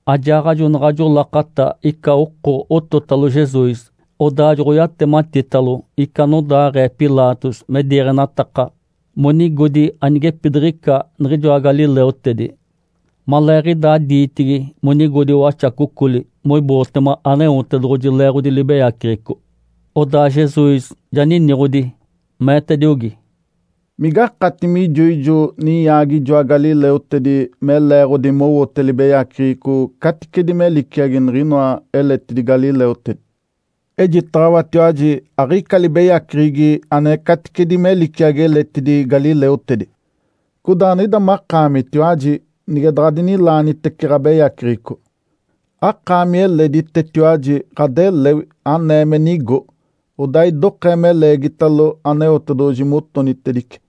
Ajaaɡ̶ajo naɡ̶ajo lakata ica oko ototalo Jesus, odaa joɡ̶oyatematitalo ica anodaaɡ̶ee Pilatos me diiɡ̶enataka monigodi anigepidiɡ̶ica niɡ̶ijoa galileutedi, maleeɡ̶idaa diitigi monigodi waxacocoli moibootema Aneotedoɡ̶oji leeɡ̶odi libeyaceɡ̶eco. Odaa Jesus ja niniɡ̶odi, meetediogi, “Migakati mijo ijo ninyaagi ijoa galileutedi me leeɡ̶odi mowote libeyaceɡ̶eco caticedi me liciagi niɡ̶inoa eletidi galileutedi? Ejitaɡ̶awatiwaji aɡ̶ica libeyaceɡ̶egi ane caticedi me liciagi eletidi galileutedi. Codaa niɡ̶ida makaamitiwaji nige daɡ̶adinilaanitece ɡ̶abeyaceɡ̶eco, akaami eleditetiwaji ɡ̶adelewi anee me nigo, odaa idokee me leegitalo Aneotedoɡ̶oji motonitedice.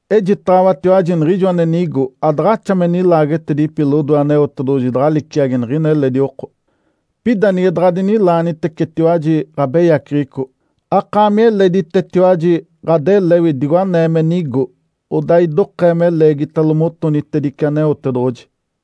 Ejitaɡ̶awatiwaji niɡ̶ijo ane nigo adaɡ̶axa me nilaagetedipi lodoe Aneotedoɡ̶oji daɡ̶a liciagi niɡ̶ina eledi oko. Pida nige daɡ̶adinilaanitecetiwaji ɡ̶abeyaceɡ̶eco, akaami eleditetiwaji ɡ̶adelewi digo anee me nigo, odaa idokee me leegitalo motonitedice Aneotedoɡ̶oji.”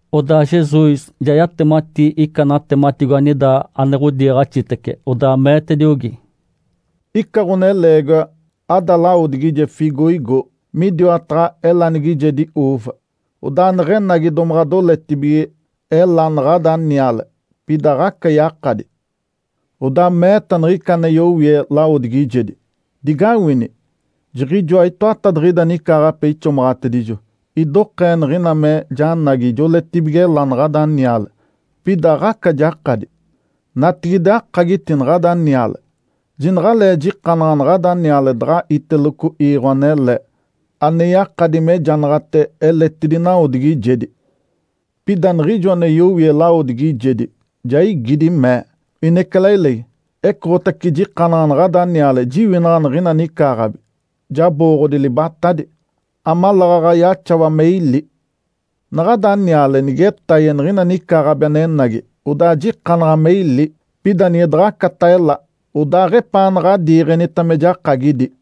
Odaa Jesus ja yatemati ica natematigo anida ane ɡ̶odiiɡ̶axitece, odaa meetediogi, “Ica ɡ̶oneleegiwa ada lawodigije fiigoigo midiwataɡ̶a elanigijedi ‘uuva’. Odaa neɡ̶enagi domaɡ̶a doletibige ela naɡ̶ada niale, pida aɡ̶aca yakadi. Odaa meeta niɡ̶ica ane yowie lawodigijedi, ‘Digawini! Jiɡ̶ijoa itoatadiɡ̶ida nicaaɡ̶ape ixomaɡ̶atedijo, idokee niɡ̶ina me janagi joletibige ela naɡ̶ada niale, pida aɡ̶aca jakadi. Natigide akagiti naɡ̶ada niale! Jinaɡ̶alee jikanaɡ̶a naɡ̶ada niale daɡ̶a iteloco iiɡ̶o anele, ane yakadi mejanaɡ̶ate eletidi nawodigijedi.’ Pida niɡ̶ijo ane yowie lawodigijedi ja igidi, mee, ‘Inecalailegi, ecoɡ̶otace jikanaɡ̶a naɡ̶ada niale jiwinaɡ̶a niɡ̶ina nicaaɡ̶abi, jabooɡ̶odi libatadi, amaleeɡ̶aɡ̶a yaxawa me ili. Naɡ̶ada niale nigetaye niɡ̶ina nicaaɡ̶abi anenagi, odaa jikanaɡ̶a me ili. Pida nige daɡ̶acata ela, odaaɡ̶epaanaɡ̶a adiiɡ̶enita me jakagidi.’”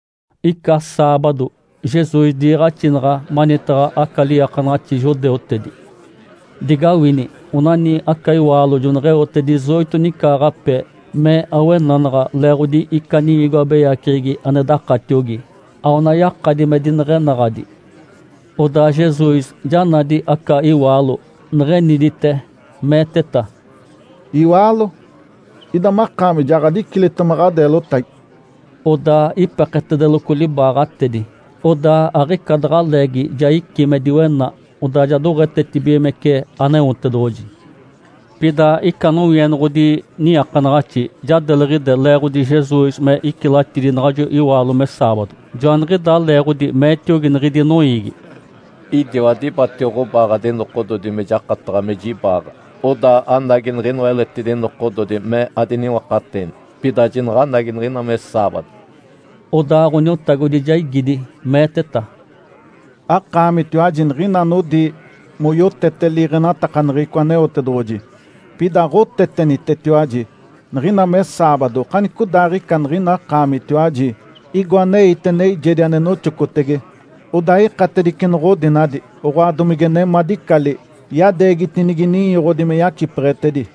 Ica saabado Jesus diiɡ̶axinaɡ̶a manitaɡ̶a aca liiakanaɡ̶axi judeutedi. Digawini! Onani aca iwaalo joneɡ̶eote dezoito nicaaɡ̶ape me awenanaɡ̶a leeɡ̶odi ica niwigo abeyaceɡ̶egi ane dakatiogi. Aona yakadi me dineɡ̶enaɡ̶adi. Odaa Jesus ja nadi aca iwaalo, neɡ̶enidite, meeteta, “Iwaalo, ida makaami ja ɡ̶adicilitema ɡ̶adeelotagi!” Odaa ipeketedeloco libaaɡ̶atedi, odaa aɡ̶ica daɡ̶a leegi ja icí me diwena, odaa ja doɡ̶etetibigimece Aneotedoɡ̶oji. Pida ica nowienoɡ̶odi niiakanaɡ̶axi ja deliɡ̶ide, leeɡ̶odi Jesus me icilatidi naɡ̶ajo iwaalo me saabado. Joaniɡ̶idaa leeɡ̶odi meetiogi niɡ̶idi noiigi, “Idiwa dibatio ɡ̶obaaɡ̶adi nokododi me jakataɡ̶a me jibaaɡ̶a. Odaa anagi niɡ̶inoa eletidi nokododi me diniwakateeni, pida jinaɡ̶anagi niɡ̶ina me saabado.” Odaa Ǥoniotagodi ja igidi, meeteta, “Akaamitiwaji niɡ̶ina anodi moyotete liiɡ̶enatakaneɡ̶eco Aneotedoɡ̶oji, pida aɡ̶otetenitetiwaji! Niɡ̶ina me saabado okanicodaaɡ̶ica niɡ̶ina akaamitiwaji igo aneite neijedi ane noxocotege, odaa ikatedice noɡ̶odinadi, oɡ̶oa, domige nemadicali yadeegitinigi ninyoɡ̶odi me yacipeɡ̶etedi.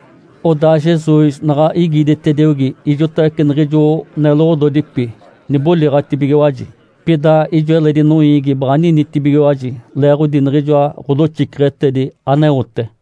Odaa Jesus naɡ̶a igiditediogi, ijotawece niɡ̶ijo neloɡ̶ododipi niboliɡ̶atibigiwaji. Pida ijo eledi noiigi baɡ̶a ninitibigiwaji leeɡ̶odi niɡ̶ijoa ɡ̶odoxiceɡ̶etedi aneote.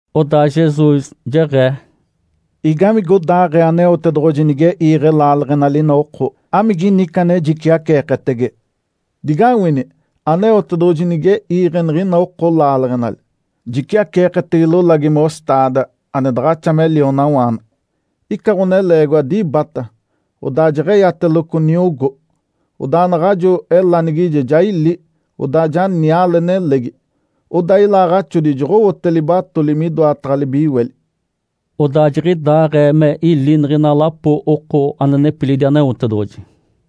Odaa Jesus jeɡ̶ee, “Igamigodaaɡ̶ee Aneotedoɡ̶oji nige iiɡ̶e laaleɡ̶enali ina oko? Amigini ica ane jiciaceeketege? Digawini! Aneotedoɡ̶oji nige iiɡ̶e niɡ̶ina oko laaleɡ̶enali, jiciaceeketege lolagi ‘mostaada’ ane daɡ̶axa me lionawaana. Ica ɡ̶oneleegiwa dibata, odaa jeɡ̶eyateloco niogó. Odaa naɡ̶ajo elanigije ja ili, odaa ja niale nelegi. Odaa ilaaɡ̶axodi joɡ̶owote libatoli midoataɡ̶a libiweli.” (Odaa jiɡ̶idaaɡ̶ee me ili niɡ̶ina lapo oko ane nepilidi Aneotedoɡ̶oji).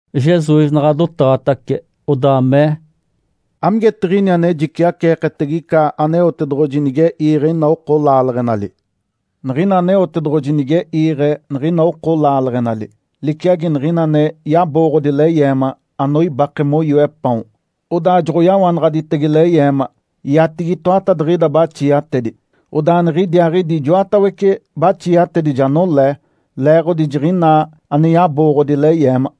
Jesus naɡ̶a dotaɡ̶atace, odaa mee, “Amigetiɡ̶ini ane jiciaceeketege ica Aneotedoɡ̶oji nige iiɡ̶e ina oko laaleɡ̶enali? Niɡ̶ina Aneotedoɡ̶oji nige iiɡ̶e niɡ̶ina oko laaleɡ̶enali, liciagi niɡ̶ina ane yabooɡ̶odi leyeema anoibake moyoe paon, odaa joɡ̶oyawanaɡ̶aditege leyeema oiatigi itoatadiɡ̶ida baxiatedi, odaa niɡ̶idiaaɡ̶idi ijoatawece baxiatedi ja nolee leeɡ̶odi jiɡ̶inaa ane yabooɡ̶odi leyeema.”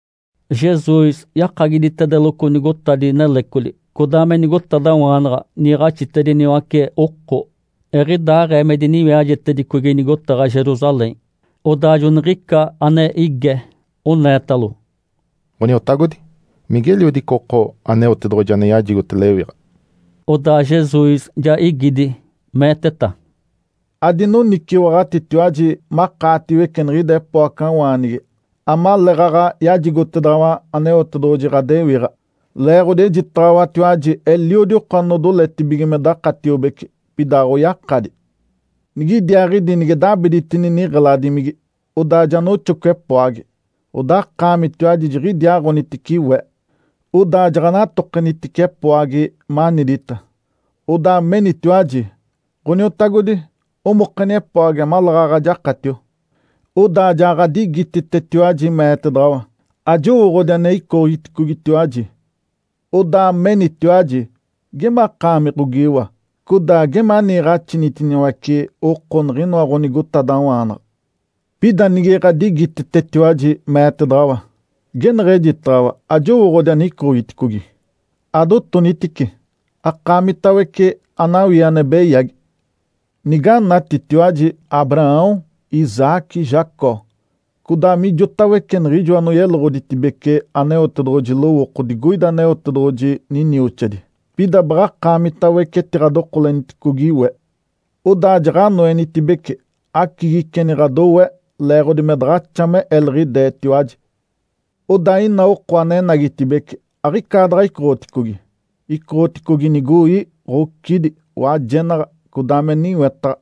Jesus yakagiditedeloco nigotadi nelecoli, codaa me nigotadawaanaɡ̶a, niiɡ̶axitediniwace oko, eɡ̶idaaɡ̶ee me diniwiajetedicogi nigotaɡ̶a Jerusalém. Odaa joniɡ̶ica ane ige, oneetalo, “Ǥoniotagodi, migeliodi ica oko Aneotedoɡ̶oji ane yajigote lewiɡ̶a?” Odaa Jesus ja igidi, meeteta, “Adinoniciwaɡ̶atitiwaji makaatiwece niɡ̶ida epoacawaanigi amaleeɡ̶aɡ̶a yajigotedaɡ̶awa Aneotedoɡ̶oji ɡ̶adewiɡ̶a. Leeɡ̶odi ejitaɡ̶awatiwaji eliodi oko anodoletibige me dakatiobece, pida aɡ̶oyakadi. Nigidiaaɡ̶idi nige dabiditini niɡ̶eladimigi, odaa ja noxoco epoagi, odaa akaamitiwaji jiɡ̶idiaaɡ̶onitice we. Odaa jaɡ̶anatokenitice epoagi, manidita, odaa menitiwaji, ‘Ǥoniotagodi, omokeni epoagi amaleeɡ̶aɡ̶a jakatio.’ Odaa ja ɡ̶adigititetiwaji, meetedaɡ̶awa, ‘Ajowooɡ̶odi ane icoɡ̶iticogitiwaji!’ Odaa menitiwaji, ‘Gemakaami ɡ̶ogiiwa, codaa geme aniiɡ̶axinitiniwace oko niɡ̶inoa ɡ̶onigotadawaanaɡ̶a.’ Pida nige ɡ̶adigititetiwaji, meetedaɡ̶awa, ‘Geneɡ̶ejitaɡ̶awa, ajowooɡ̶odi ane icoɡ̶iticogi. Adotonitice akaamitawece anawii ane beyagi!’ Niganatitiwaji Abraão, Isaque, Jacó, codaa mijotawece niɡ̶ijo anoyeloɡ̶oditedibece Aneotedoɡ̶oji lowooko digoida Aneotedoɡ̶oji ninioxadi, pida baɡ̶akaamitawece etiɡ̶adokoleniticogi we, odaa jaɡ̶anoenitibece, acigiceni ɡ̶adowe leeɡ̶odi me daɡ̶axa me eliɡ̶ideetiwaji. Odaa ina oko ane enagitibeci aɡ̶icaadaɡ̶a icoɡ̶oticogi, icoɡ̶oticogi nigoi, ɡ̶ocidi, wajenaɡ̶a, codaa me niwetaɡ̶a.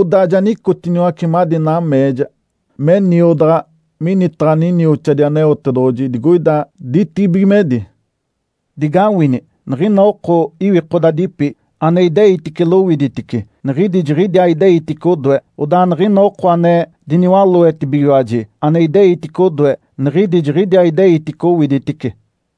Odaa ja nicotiniwace madi nameeja me niodaɡ̶a minitaɡ̶a ninioxadi Aneotedoɡ̶oji digoida ditibigimedi. Digawini! Niɡ̶ina oko iwikodadipi, ane ideitice lowiditice, niɡ̶idi jiɡ̶idiaa ideitice odoe. Odaa niɡ̶ina oko ane diniwaloetibigiwaji ane ideitice odoe, niɡ̶idi jiɡ̶idiaa ideitice owiditice.”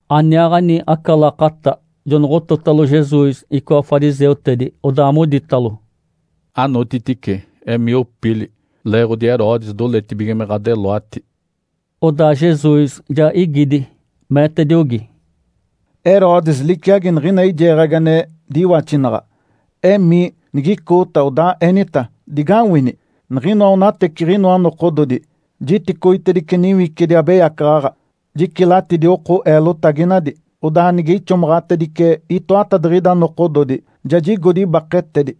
Aniaaɡ̶ani aca lakata jonoɡ̶ototalo Jesus icoa fariseutedi, odaa moditalo, “Anotitice, emii opili leeɡ̶odi Herodes doletibige me ɡ̶adeloati!” Odaa Jesus ja igidi, meetediogi, “Herodes liciagi niɡ̶ina eijeeɡ̶agi ane diwaxinaɡ̶a. Emii, nigicoota, odaa enita, ‘Digawini! Niɡ̶inoa onateciɡ̶inoa nokododi, jiticoitedice niwicidi abeyacaɡ̶aɡ̶a, jicilatidi oko eelotaginadi. Odaa nige ixomaɡ̶atedice itoatadiɡ̶ida nokododi, ja jigodi ibaketedi.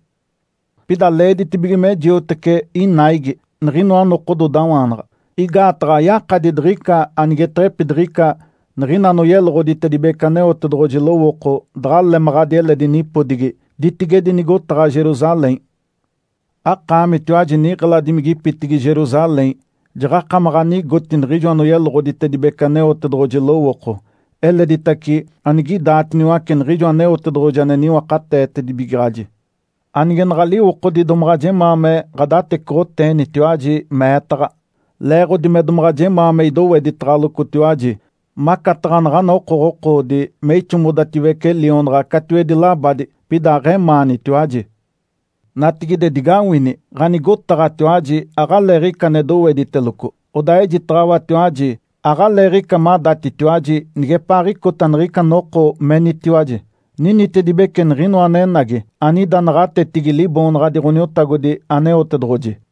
Pida leeditibige me jiotece inaigi niɡ̶inoa nokododawaanaɡ̶a. Igaataɡ̶a ayakadi diɡ̶ica anigeteɡ̶epidiɡ̶ica niɡ̶ina anoyeloɡ̶oditedibece Aneotedoɡ̶oji lowooko daɡ̶a lemaɡ̶adi eledi nipodigi ditigedi nigotaɡ̶a Jerusalém.’ Akaamitiwaji niɡ̶eladimigipitigi Jerusalém, jaɡ̶akamaɡ̶a anigoti niɡ̶ijo anoyeloɡ̶oditedibece Aneotedoɡ̶oji lowooko, eleditace anigidaatiniwace niɡ̶ijo Aneotedoɡ̶oji ane niwakateetedibigaɡ̶aji. Anigenaɡ̶a liwokodi domaɡ̶a jemaa me ɡ̶adatecoɡ̶oteenitiwaji meetaɡ̶a, leeɡ̶odi me domaɡ̶a jemaa me idoweditaɡ̶alocotiwaji, macataɡ̶a naɡ̶ana okoɡ̶okoodi me ixomodatediwece lionaɡ̶a catiwedi labadi. Pida aɡ̶emaanitiwaji. Natigide, digawini! Ǥanigotaɡ̶atiwaji aɡ̶aleeɡ̶ica ane dowediteloco. Odaa ejitaɡ̶awatiwaji, aɡ̶aleeɡ̶ica madatitiwaji nigepaaɡ̶icota niɡ̶ica noko menitiwaji, ‘Ninitedibece Niɡ̶inoa anenagi, anida naɡ̶atetigi Liboonaɡ̶adi Ǥoniotagodi Aneotedoɡ̶oji!’”